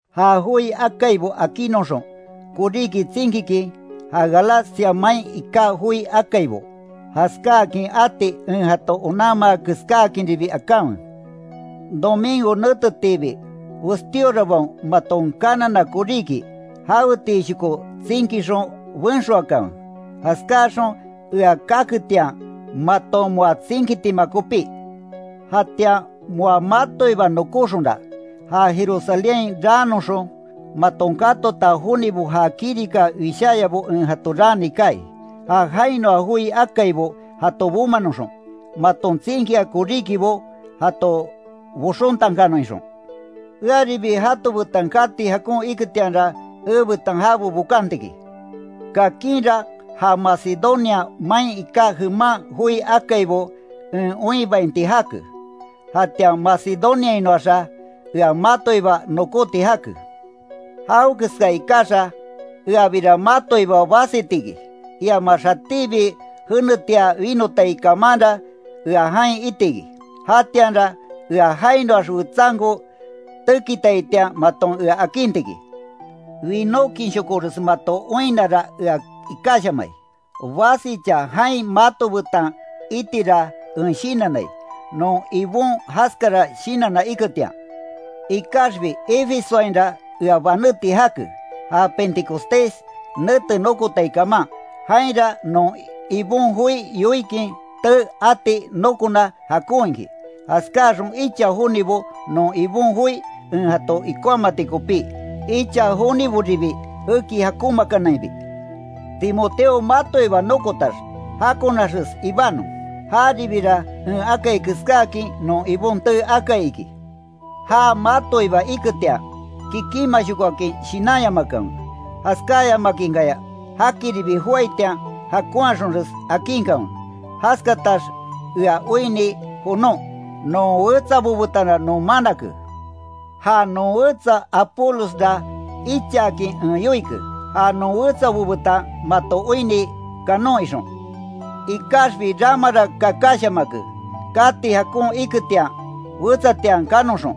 Ja joi akaibo akinnoxon, koríki tsinkikin, ja Galacia main iká joi akaibo, jaskáakin ati en jato onanmaa keskáakinribi akanwe. Domingo netetiibi westíorabaon maton kanana koríki, jawetiishoko tsinkixon benxoakanwe, jaskáaxon ea kaketian, maton moa tsinkitima kopí. Jatian moa matoiba nokóxonra, ja Jerusalénhain raanoxon, maton katota jonibo ja kirika wisháyabo en jato raani kaai, ja jainoa joi akaibo jato bomanoxon, maton tsinkia koríkibo jato boxontankanon ixon. Earibi jato betan kati jakon iketianra, ebetan jabo bokanti iki. Kakinra ja Macedonia main iká jeman joi akaibo en oinbainti jake, jatian Macedoniainoaxa ea matoiba nokóti jake, jawekeska ikaxa, eabira matoiba basiti iki, iamax jatíbi jenetia winotai kamanra ea jain itiki, jatianra ea jainoax wetsanko tekitaitian maton ea akinti iki. Winókinshokores mato oinnara ea ikáshamai, basicha jain mato betan itira en shinannai, non Ibon jaskara shinanna iketian. Ikaxbi Efesoainra ea baneti jake, ja pentecostés nete nokotai kaman. Jainra non Ibon joi yoikin tee ati nokona jakon iki, jaskáxon icha jonibo non Ibon joi en jato ikonhamati kopí, icha joniboribi eki jakonmaakanainbi. Timoteo matoiba nokotax, jakonaxes ibanon, jaribira en akai keskáakin non Ibon tee akai iki. Ja matoiba iketian, kikínmashokoakin shinanyamakanwe, jaskayamakinkaya jakiribi joaitian, jakonhaxonres akinkanwe. Jaskatax ea oinni jonon, non wetsabo betanra non manake. Ja non wetsa Apolosra ichaakin en yoike, ja non wetsabo betan mato oinni kanon ixon, ikaxbi ramara kakashamake, kati jakon iketian, wetsatian kanoxon.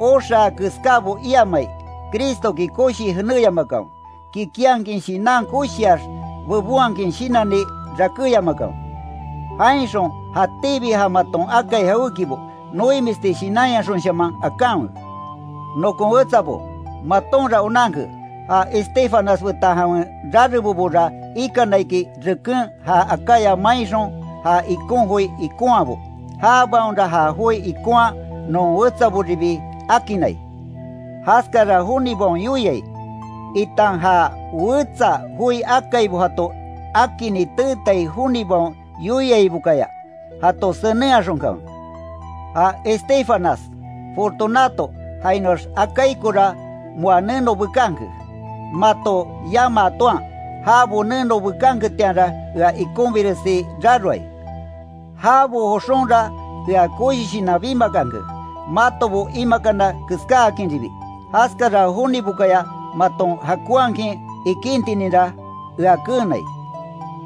Oxaa keskábo iamai, Cristoki koshii jeneyamakanwe, kikinhakin shinan koshiax bebonhakin shinanni rakéyamakanwe. Jainxon jatíbi ja maton akai jawékibo, noimisti shinanyaxonshaman akanwe. Nokon wetsabo, matonra onanke, ja Estéfanas betan jawen rarebobora ikana iki reken ja Acaya mainxon ja ikon joi ikonhaabo. Jabaonra ja joi ikonhaa non wetsaboribi akinnai. Jaskara jonibaon yoiai, itan ja wetsa joi akaibo jato akini teetai jonibaon yoiaibokaya, jato senenhaxonkanwe. Ja Estéfanas, Fortunato jainoax Acaicora moa neno bekanke, mato yamaa toan jabo neno bekanketianra ea ikonbiresi raroai, jabo joxonra ea koshi shinan bimakanke, matobo imakana keskáakinribi, jaskara jonibokaya maton jakonhakin ikíntininra, ea keenai.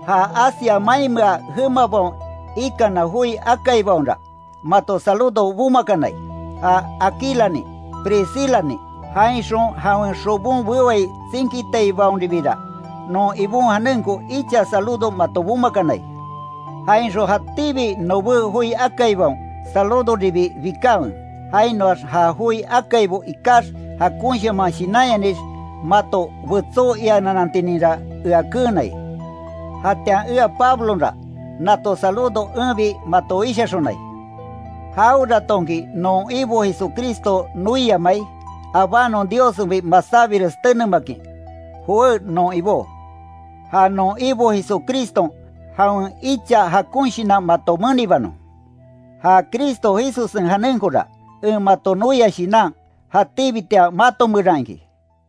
Ja Asia mainmea jemabaon ikana joi akaibaonra, mato saludo bomakanai, ja Aquilanin, Priscilanin, jainxon jawen xobon bewai tsinkitaibaonribira, non Ibon janenko icha saludo mato bomakanai, jainxon jatíbi nobé joi akaibaon saludoribi bikanwe, jainoax ja joi akaibo ikax jakonshaman shinanyanix mato betsó iananantininra ea keenai. Jatian ea Pablonra, nato saludo enbi mato wishaxonai. Jaweratonki non Ibo Jesucristo noiamai, abánon Diossenbi masábires tenemakin ¡Jowé non Ibó! Ja non Ibo Jesucriston jawen icha jakon shinan mato menibanon, ja Cristo Jesussen janenkora, en mato noia shinan, jatíbitian mato meran iki.